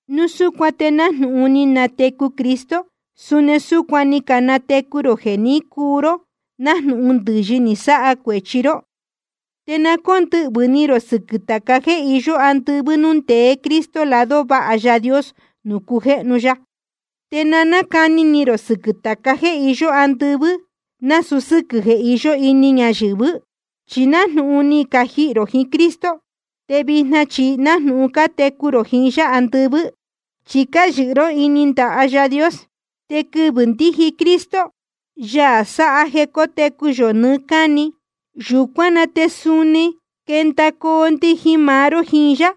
Núu súcuan te nájnūhun ni natecu Cristo, suni súcuan ni canatecu rō jeē ní cuu ró nájnūhun ndɨ̄yɨ ni sáha cuēchi ró. Te na cóndɨhvɨ̄ ni rō sɨquɨ̄ tāca jéē iyó andɨvɨ́ núū ndeé Cristo lado váha Yaā Dios nuū cujéhnu ya. Te na cáni ni rō sɨquɨ̄ tāca jéē iyó andɨvɨ́, nasūu sɨ́quɨ̄ jeē iyó ini ñayɨ̄vɨ́. Chi nájnūhun je ni cajihī rō jiín Cristo, te vijna chi nájnūhun cátecu rō jiín yá andɨvɨ́, chi cáyɨhɨ ró ini ndaha Yaā Dios. Te quɨvɨ̄ ndíji Cristo, Yaā sáha jeē cótecu yō nɨɨ́ cáni, yūcuán na te suni quendacoo ndijin maá ró jiín yá,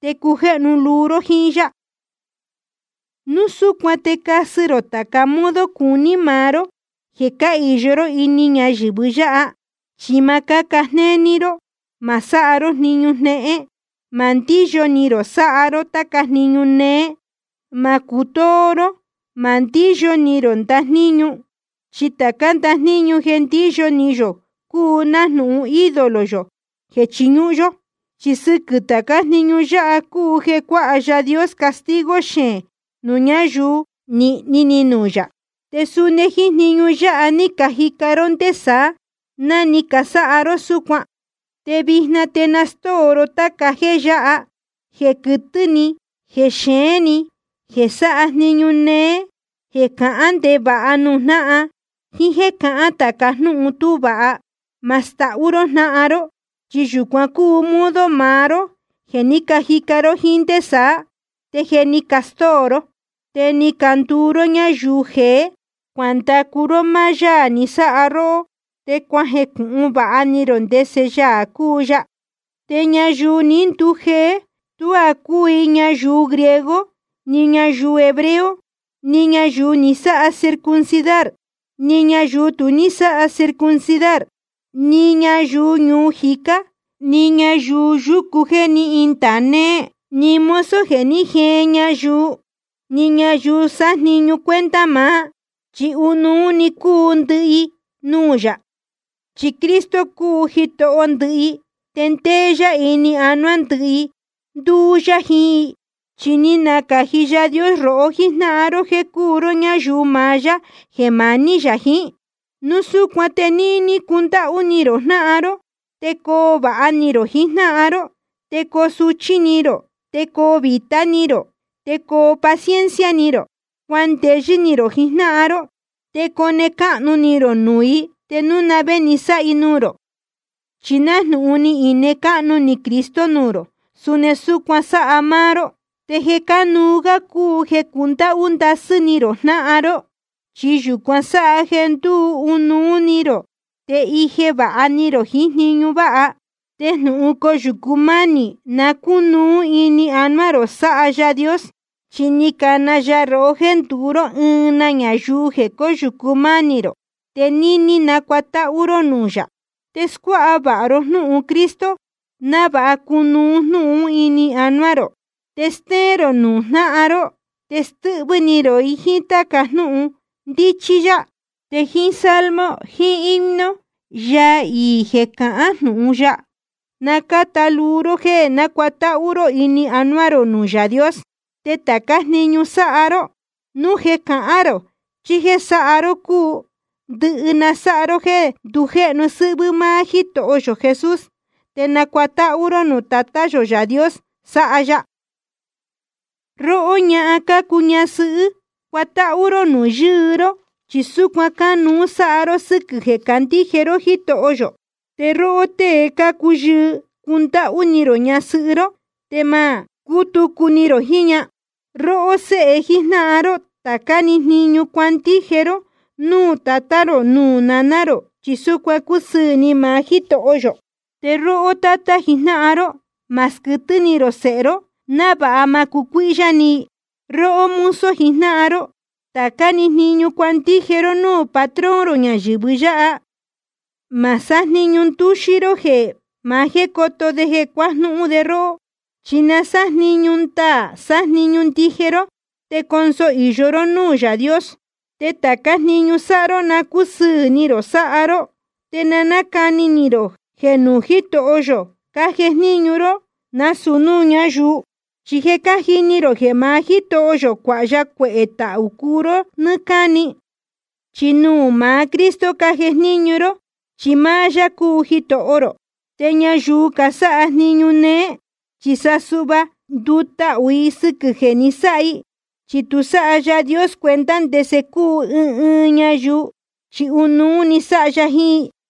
te cujéhnu luu ró jíín yá. Núu súcuan te casɨ rō tāca modo cuní maá ró jeē cáhīyo ró ini ñayɨ̄vɨ yáha. Chi ma cáca jnéní ró, ma sáha ró jniñu jnéhén, ma ndíyo ni rō sáha ró táca jniñu néé, ma cutóó ró, ma ndíyo ni rō ndajníñu. Chi tācá ndajníñu jeē ndíyo ni yō cúu nájnūhun ídolo yō jeē chiñúhún yó. Chi sɨquɨ̄ tācá jniñu yáha cúu jeē cuāha Yaā Dios castigo xeēn nuū ñáyuu nīhni ni nuū yā. Te suni jíín jniñu yáha ní cajica ró ndé saá, ná ni casáha ró súcuan. Te vijna te na stóo ró táca jéē yáha: jeē quɨtɨ́ ni, jeē xeēn ni, jeē sáha jniñu néé, jeē cahán ndevāha nuū jnáhan, jíín jéē cahán tāca jnúhun tú vāha. Ma stahú ró jnáhan ró, chi yūcuan cúu modo maá ró jeē ní cajica ró jíín ndé saá, te je ni castóo ró. Te ni canduu ró ñáyuu jeé, cuandacu ró máá Yaā ni sáha róhó, te cuajecūhun vāha ni rō ndese Yaā cúu ya. Te ñayuu ní ndujeé tuá cúu i ñayuu griego, ni ñayuu hebreo, ni ñayuu ni sáha circuncidar, ni ñayuu tu ní sáha circuncidar, ni ñayuu ñuu jicá, ni ñayuu yucú jeē ní indāa néé, ni mozo jeē ní jeen ñayuu, ni ñayuu sájniñu cuenta maá, chi ɨnuú cúu ndɨhɨ i nuū yā. Chi Cristo cúu Jitoho ndɨhɨ i, te ndéé yá ini anuá ndɨhɨ i, ndúú yá jiín i. Chi ni nacāji Yaā Dios rohó jíjnáhan ró jeē cúu ró ñáyuu maá yá jeē maní yā jiín. Núu súcuan te níní cundáhú ni rō jnáhan ró, te coo vāha ni rō jiín jnáhan ró. Te coo suchí ni rō, te coo vītá ni rō, te coo paciencia ni rō. Cuandeyɨ́ ni rō jiín jnáhan ró, te cone cáhnu ni rō nuū i te núu na vé ni sáha i nuū rō. Chi nájnūhun ni ine cáhnu ni Cristo nuū rō, suni súcuan sáha máá ró. Te jeē cánuú gá cúu jeē cundáhú ndasɨ́ ni rō jnáhan ró. Chi yūcuan sáha jeē ndúu ɨnuú ni rō te íje vāha ni rō jiín jniñu váha. Te jnūhun coyūcu mánī na cúnuú ini anuá rō sáha Yaā Dios. Chi ni cana ya rohó jéē nduu ró ɨɨn na ñayuu jéē cóyūcu mánī rō. Te níní na nácuatáhú ró núū yā. Te scuáha vāha ró jnúhun Cristo návāha cunuú jnúhun ún ini anuá rō. Te stéén rō nuū jnáhan ró, te stɨ́hvɨ́ ni rō i jíín táca jnúhun ndíchí yá. Te jíín salmo jiín himno, yaa iī jeē cahán jnūhun ya, na cáta luu ró jéē nácuatáhú ró ini anuá rō nuū Yaā Dios. Te tācá jniñu sáha ró, núu jeē cahán rō chí jéē sáha ró cúu, ndɨhɨ na sáha ró jéē ndujéhnu sɨ́hvɨ́ máá Jítoho yō Jesús, te nacuatáhú ró núū Tatá yō Yaā Dios sáha ya. Róhó ñahan cácuu ñasɨhɨ́, cuatáhú ró nuū yɨɨ ró, chi súcuan cánuú sáha ró sɨ́quɨ̄ jeē candíje ró Jítoho yō. Te róhó tée cácuu yɨɨ, cundáhú ni rō ñasɨhɨ́ ró, te ma cútucu ni rō jiín ña. Róhó séhe jíjnáhan ró, tācá‑ni jniñu cuandije ró núū tatá rō nuū naná rō, chi súcuan cúsɨɨ̄ ni maá Jítoho yō. Te róhó tátá jijnáhan ró, ma squɨtɨ́ ni rō sēhe ró, návāha ma cucuíhyá ni i. Róhó mozo jijnáhan ró, tācá‑ni jniñu cuandije ró núū patrón rō ñayɨ̄vɨ yáha. Ma sájniñu ndúxí ró jeē maá jéē coto de te cuajnúhún de róhó. Chi na sájniñu ndaā sájniñu ndije ró, te conso īyo ró núū Yaā Dios. Te tācá jniñu sáha ró, na cúsɨɨ̄ ni rō sáha ró, te na cáni ni rō jeē nuū Jítoho yō cájejníñu ró, nasūu núū ñáyuu. Chi je cájini rō jeē maá Jítoho yō cuāha ya cuehē tahū cuu ró nɨ́ɨ́ cáni. Chi nuū maá Cristo cájejníñu ró, chi máá yá cúu Jitoho rō. Te ñayuu casáha jniñu néé, chi sa suhva ndutahū i sɨquɨ̄ jeē ni sáha i. Chi tu sáha Yaā Dios cuenta ndese cúu ɨɨn ɨɨn ñayuu, chi ɨnuú sáha ya jiín i.